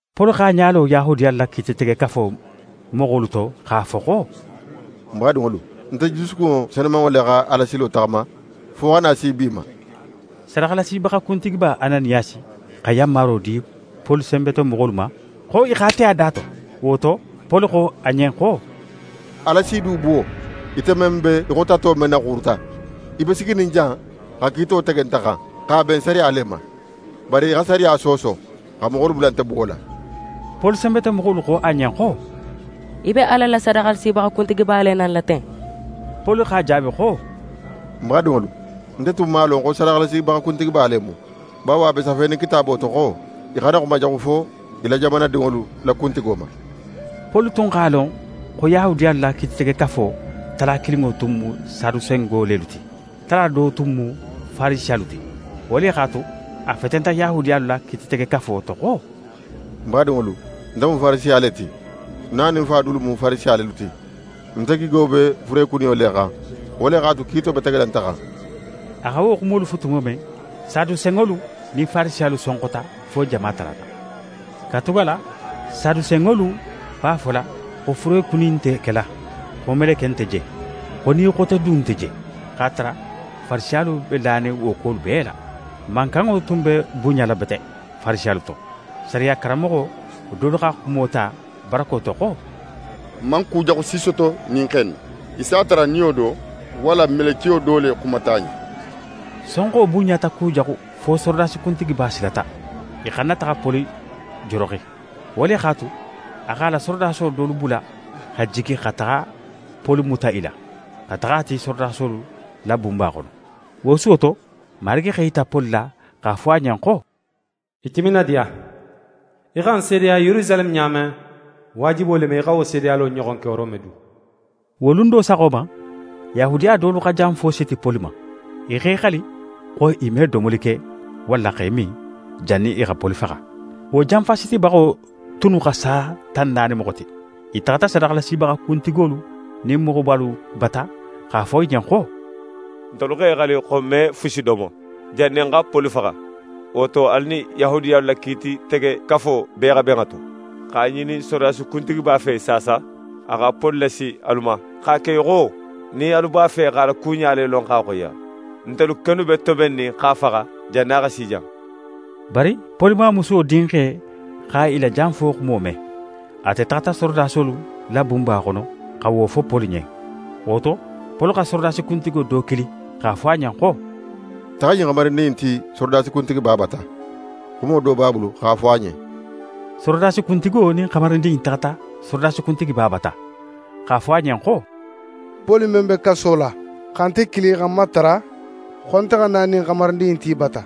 Poli x'a ɲa lo Yahudiyalu la Kiititegekafo moxolu to x'a fo xo: «Ń badinŋolu, nte jusukunŋo senumanŋo le xa Alasilo taxama fo xa na si bi ma.» Sadaxalasibaxa kuntigiba Ananiyasi xa yanmaro di Poli senbetomoxolu ma xo i x'a te a da to. Wo to, Poli xo a ɲen xo: «Ala s'í du buwo, ite men be í xo tato men naxuuruta! Í be siginin jan xa kiito tege nte xan, x'a ben sariya le ma. Bari í xa sariya sooso, xa moxolu bula nte buwola.» Poli senbetomoxolu xo a ɲen xo: «Í be Ala la sadaxalasibaxa kuntigiba le nanila ten!» Poli x'a jaabi xo: «Ń badinŋolu, nte tun man a lon xo sadaxalasibaxa kuntigiba le mu. Bawo, a be safenin Kitaabo to xo: “Í xana xuma jaxu fo í la jamana dinŋolu la kuntigo ma.”» Poli tun x'a lon xo Yahudiyalu la Kiititegekafo tala kilinŋo tun mu Sadusenŋo lelu ti, tala do tun mu Farisiyalu ti. Wo le x'a tu, a fetenta Yahudiyalu la Kiititegekafo to xo: «Ń badinŋolu, nte mu Farisiya le ti. Ń na nin ń fa dulu mu Farisiya lelu ti. Nte gigo be furekuniyo le xan, wo le x'a tu, kiito be tegela nte xan.» A xa wo xumolu fo tumo men, Sadusenŋolu nin Farisiyalu sonxota fo jama talata. Katugala Sadusenŋolu b'a fola, xo furekuni nte kela, xo meleke nte je, xo ni xote du nte je; x'a tara Farisiyalu be lanin wo kuwolu bee la. Mankanŋo tun be bunɲala bete, Farisiyalu to, sariya karanmoxo dolu xa xumo ta barako to xo: «N man kujaxu si soto ɲin xe in na. Í s'a tara niyo do walla melekiyo do le xumata a ɲen.» Sonxo bunɲata kujaxu fo sorodasi kuntigiba silata, i xana taxa Poli joroxi. Wo le x'a tu, a x'a la sorodaso dolu bula xa jigi xa taxa Poli muta i la, xa taxa a ti sorodasolu la bunba xono. Wo suwo to, Marigi x'é yita Poli la x'a fo a ɲen xo: «Í timinadiya, í xa ń seedeya Yerusaleme ɲa men, waajibo le mu í xa wo seedeyalo ɲoxon ke Rome du.» Wo lun do saxo ma, Yahudiya dolu xa janfo siti Poli ma. I x'e xali xo i me domoli ke, walla x'e min, jannin i xa Poli faxa. Wo janfasitibaxo tunnu xa sa tan naani moxo ti. I taxata sadaxalasibaxa kuntigolu nin moxobalu bata x'a fo i ɲen xo: «N x'e xali xo n me fusi domo, jannin n xa Poli faxa. Wo to, alu nin Yahudiyalu la Kiititegekafo bee xa ben a to x'a ŋinin sorodasi kuntigiba fe saasa, a xa Poli lasi alu ma, x'a ke í xo nin alu b'a fe x'a la kuɲa le lon x'a xoyiya. Ntelu kennu be tobennin x'a faxa jannin a xa si jan.» Bari Poli mamusuwo dinxe xa i la janfo xumo me. Ate taxata sorodasolu la bunba xono xa wo fo Poli ɲen. Wo to, Poli xa sorodasi kuntigo do kili x'a fo a ɲen xo: «Taxa ɲin xamarindin in ti sorodasi kuntigiba bata, xumo do b'a bulu x'a fo a ɲen.» Sorodasi kuntigo nin xamarindin in taxata sorodasi kuntigiba bata, x'a fo a ɲen xo: «Poli men be kaso la xa nte kili xa ń matara xo nte xa na ɲin xamarindin in ti í bata,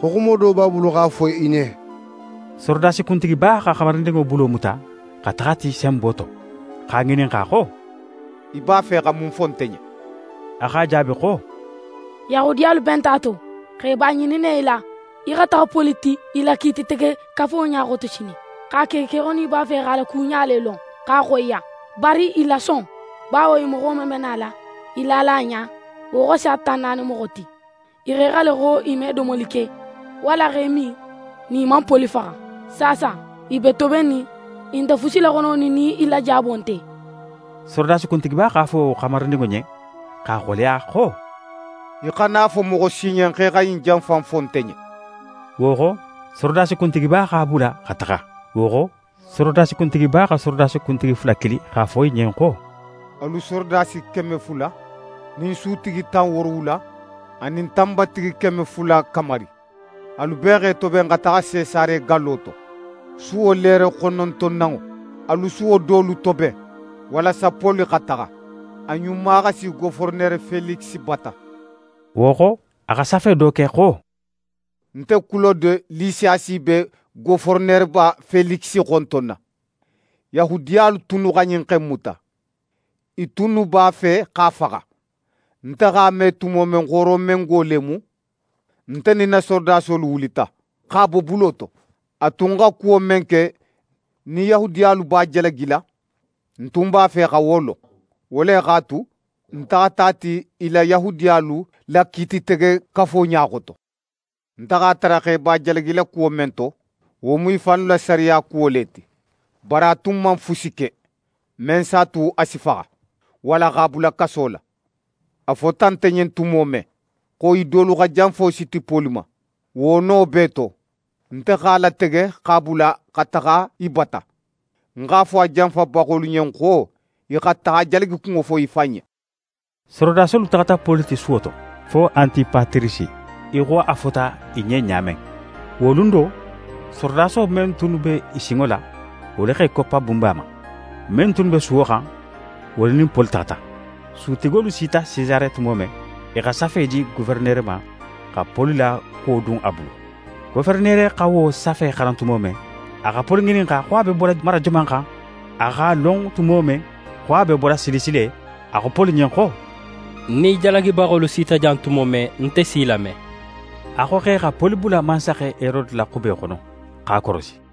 xo xumo do b'a bulu x'a fo í ɲen.» Sorodasi kuntigiba xa xamarindinŋo bulo muta xa taxa a ti senbo to, x'a ŋininxa xo: «Í b'a fe xa mun fo nte ɲen?» A x'a jaabi xo: «Yahudiyalu benta a to xo i b'a ŋininna í la, í xa taxa Poli ti i la Kiititegekafo ɲa xoto sinin, x'a ke í xo nin i b'a fe x'a la kuɲa le lon x'a xoyiya. Bari í lason, bawo i moxo men be nala i lala a ɲa, wo xa sa tan naani moxo ti. I x'e xali xo i me domoli ke, walla x'e min nin i man Poli faxa. Saasa, i be tobennin, i nte fusi laxononin nin í la jaabo nte.» Sorodasi kuntigiba x'a fo wo xamarindinŋo ɲen x'a xoleya xo: «Í xana a fo moxo si ɲen xo í xa ɲin janfa in fo nte ɲen.» Wo xo, sorodasi kuntigiba x'a bula xa taxa. Wo xo, sorodasi kuntigiba xa sorodasi kuntigi fula kili x'a fo i ɲen xo: «Alu sorodasi keme fula, nin sutigi tan woorowula, anin tanbatigi keme fula kamari. Alu bee x'e toben xa taxa Sesare gallo to, suwo leere xonontonanŋo. Alu suwo dolu toben walasa Poli xa taxa, a ɲuma xa si Goferenere Felikisi bata.» Wo xo, a xa safe do ke xo: «Nte Kulode Lisiyasi be Goferenereba Felikisi xontonna. Yahudiyalu tunnu xa ɲin xe in muta. I tunnu b'a fe x'a faxa. Nte x'a me tumo men xo Romengo le mu, nte nin ń na sorodasolu wulita, x'a bo bulo to. A tun xa kuwo men ke nin Yahudiyalu b'a jalagila, nte tun b'a fe xa wo lon. Wo le x'a tu, ń taxata a ti i la Yahudiyalu la Kiititegekafo ɲa xoto. Nte x'a tara xo i b'a jalagila kuwo men to, wo mu i fannu la sariya kuwo le ti. Bari a tun man fusi ke men s'a tu a si faxa walla x'a bula kaso la. A fota nte ɲen tumo men xo i dolu xa janfo siti Poli ma, wo no bee to, nte x'a latege x'a bula xa taxa í bata. Ń x'a fo a janfabaxolu ɲen xo i xa taxa a jalagikunŋo fo í fan ɲen.» Sorodasolu taxata Poli ti suwo to, fo Antipatirisi, í xo a fota i ɲen ɲa men. Wo lun do, sorodaso men tunnu be i sinŋo la, wolu x'e koppa bunba ma. Men tunnu be suwo xan, wolu nin Poli taxata. Sutigolu sita Sesare tumo men, i xa safe di goferenere ma xa Poli la kuwo dun a bulu. Goferenere xa wo safe xaran tumo men, a xa Poli ŋininxa xo a be bola mara joman xan? A x'a lon tumo men xo a be bola Silisi le, a xo Poli ɲen xo: «Nin í jalagibaxolu sita jan tumo men, nte si í lame.» A xo x'e xa Poli bula mansaxe Herode la xube xono, x'a korosi.